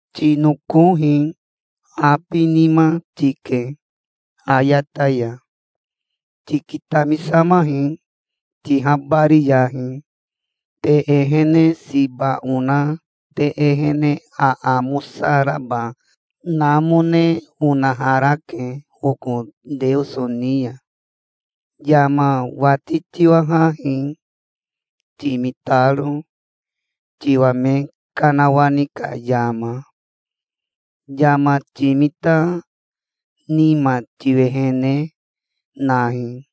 Tinokohi. Abinima tike ayata ya. Tikitamisamahi, tihabariyahi. Te ehene siba ona te ehene aamosa raba namone onaharake oko Teoso ni ya. Yama wati tiwahahi, timitaro, tiwa me kanawani ka yama. Yama timita nima tiwehene nahi.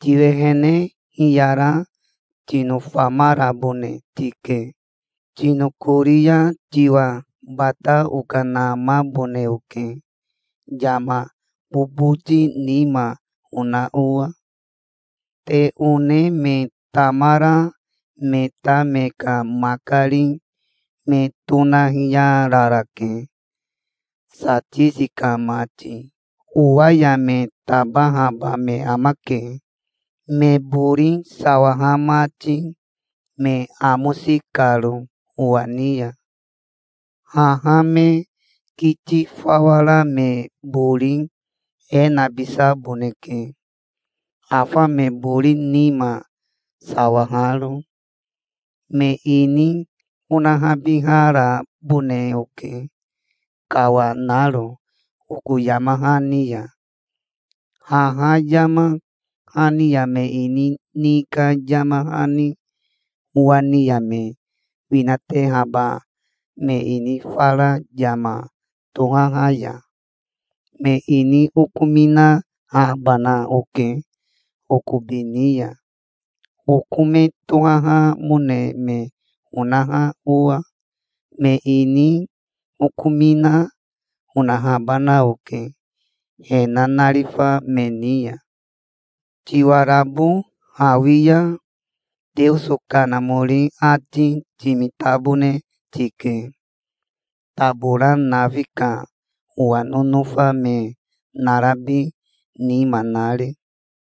Tiwehene hiyara tinofamarabone tike. Tinokori ya tiwa bata okanamabone oke, yama boboti nima ona owa. Te one me tamara me ta me ka makari me tonahiyararake, Satisi ka mati. Owa ya me tabahaba me amake, me bori sawaha mati, me amosi karo owa ni ya. Haha me kiti fawa ra me bori e nabisaboneke afa me bori nima, sawaharo. Me ini onahabiharabone oke, kawanaro oko yama hani ya, haha yama hani ya me ini ni ka yama hani, owa ni ya me winatehaba me ini fara yama tohaha ya. Me ini okominahabana oke okobi ni ya, oko me tohahamone me onaha owa. Me ini okomina, onahabana oke he nanarifa me ni ya. Tiwarabo hawi ya Teoso Kanamori ati timitabone tike, tabora nafi ka owa nonofa me narabi nima nari'".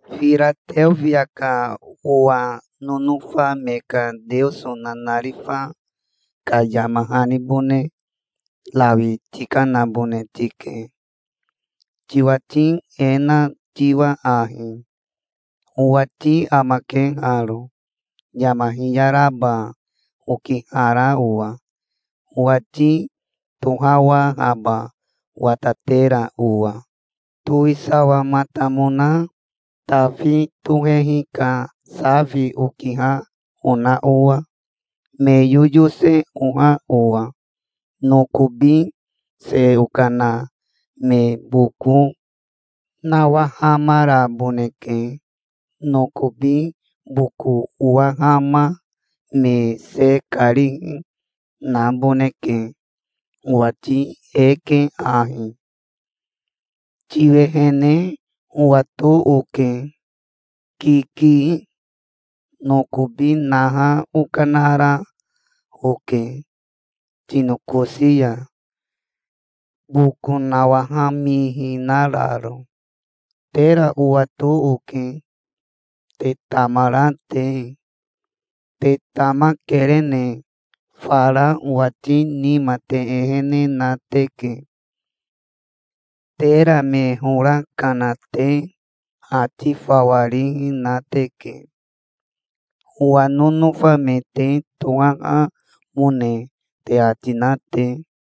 "Firateofia ka owa nonofa me ka Teoso nanarifa ka yama hanibone rawi tikanabone tike, tiwati e na tiwa ahi:" "'Owati amake haro, yama hiyaraba okihara owa, owati tohawahaba watatera owa, towisawamatamona Tafi tohehi ka safi okiha ona owa, me yoyose oha owa. Nokobi se okana me boko nawahamaraboneke. Nokobi boko owahama me se karihi naboneke. Owati e ke ahi: tiwehene owato oke. Kiki. Nokobi naha okanara oke tinokosi ya, boko nawahamihinararo. Tera owato oke, te tamara te. Te tamakerene fara owati nima te ehene na teke. Tera me hora kana te ati fawa rihi na teke, owa nonofa me te tohahamone te ati na te.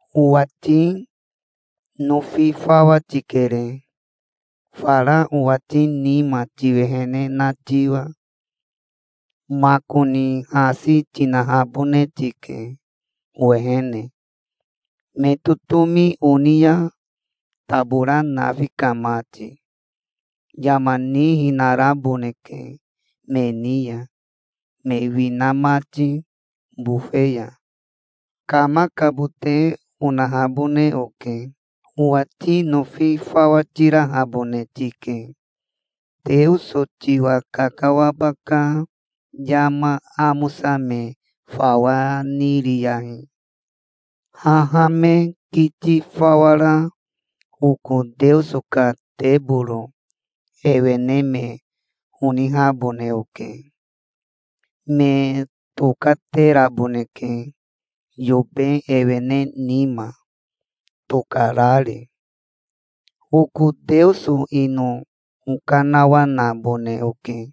Owati nofi fawa tikere, fara owati nima tiwehene na tiwa. Makoni hasi tinahabone tike owehene, me totomi oni ya, tabora nafi ka mati. Yama nihinaraboneke me ni ya, me wina mati bofe ya. Kamakabote onahabone oke. Owati nofi fawa tirahabone tike. Teoso tiwa kakawaba ka yama amosa me fawa niriyahi. Haha me kiti fawa ra oko Teoso ka teboro ewene me onihabone oke. Me tokateraboneke yobe ewene nima, tokarari. Oko Teoso ino okanawanabone oke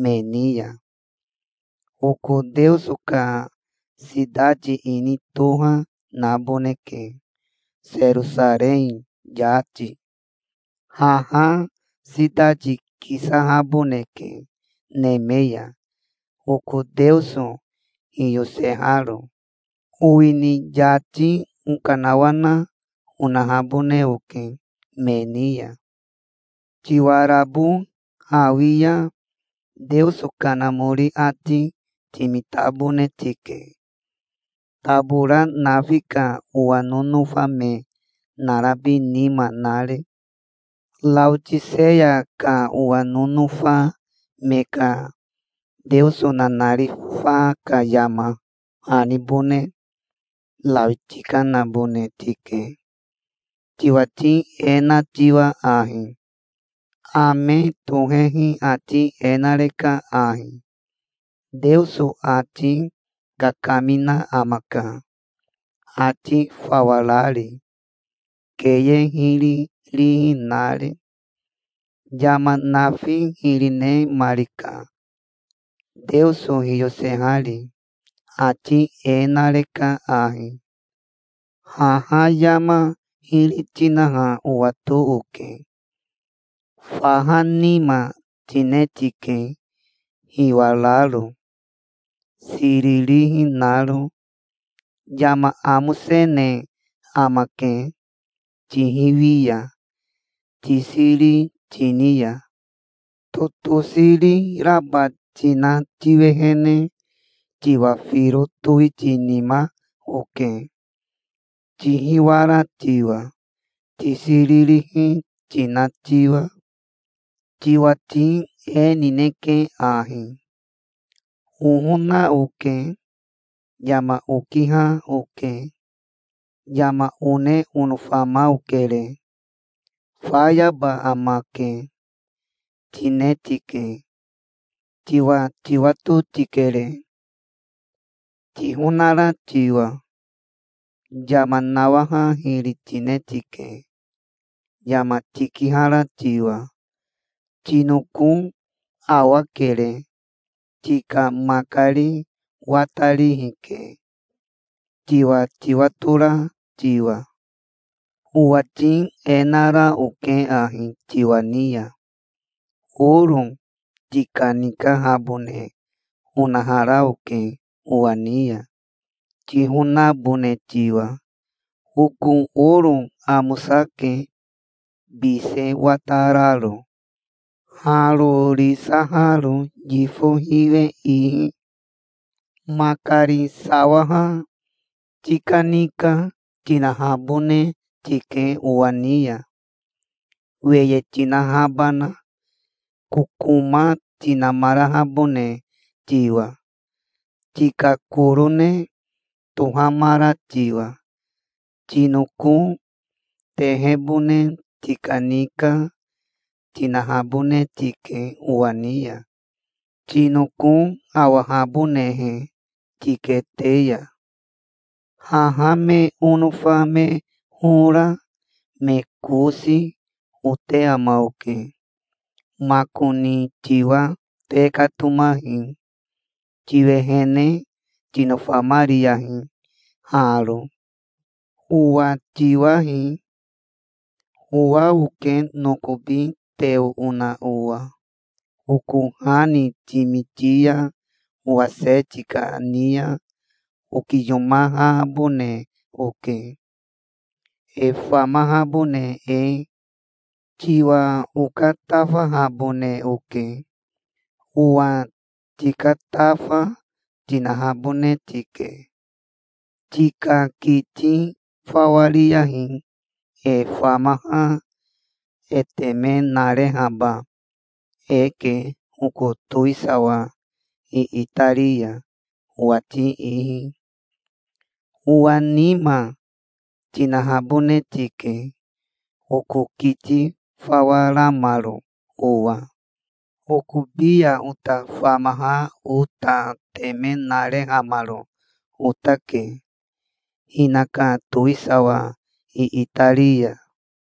me ni ya. Oko Teoso ka sitati ini toha naboneke, Serosarei yati. Haha sitati kisahaboneke neme ya, oko Teoso hiyoseharo. Owini yati okanawana onahabone oke me ni ya. Tiwarabo hawi ya Teoso Kanamori ati timitabone tike, tabora nafi ka owa nonofa me narabi nima nari'". "Raotiseya ka owa nonofa me ka Teoso nanarifa ka yama hanibone rawi tikanabone tike, tiwati e na tiwa ahi:" "'Ame tohehi ati e nareka ahi. Teoso ati kakamina amaka, ati fawa rari, keye hiri rihi nari. Yama nafi hiri nemarika, Teoso hiyosehari. Ati e nareka ahi: haha yama hiri tinaha owato oke. Faha nima tine tike, hiwararo, siririhi naro. Yama amosene amake, tihiwi ya, tisiri tini ya. Totosiri raba tina tiwehene tiwa firo towitinima oke, tihiwara tiwa, tisiririhi tina tiwa. Tiwati e nineke ahi: "Ohona oke. Yama okiha oke. Yama one onofama okere. Fayaba amake", tine tike. Tiwa tiwato tikere, tihonara tiwa. Yama nawaha hiri tine tike, yama tikihara tiwa. Tinoko awakere. Tika makari watarihi ke, tiwa tiwatora tiwa. Owati e nara oke ahi tiwa ni ya: oro tikanikahabone onahara oke owa ni ya, tihonabone tiwa. Oko oro amosake, bise watararo harorisaharo yifo hiwe ihi. Makari sawaha tikanika tinahabone tike owa ni ya, weye tinahabana, kokoma tinamarahabone tiwa, tika korone tohamara tiwa. Tinoko tehebone tikanika, tinahabone tike owa ni ya, tinoko awahabonehe tikete ya. Haha me onofa me hora, me kosi, ote ama oke. Makoni tiwa tekatomahi. Tiwehene tinofamariyahi haro. Owa tiwahi. Owa oke nokobi teo ona owa. Oko ha ni timiti ya owa se tikani ya okiyomahabone oke, e famahabone e. Tiwa okatafahabone oke. Owa tikatafa tinahabone tike. Tika kiti fawa ri ya e famaha e teme narehaba eke oko towisawa iitari ya, owati ihi. Owa nima tinahabone tike, oko kiti fawa ramaro owa. Okobi ya ota famaha ota teme narehamaro otake, hinaka towisawa iitari ya.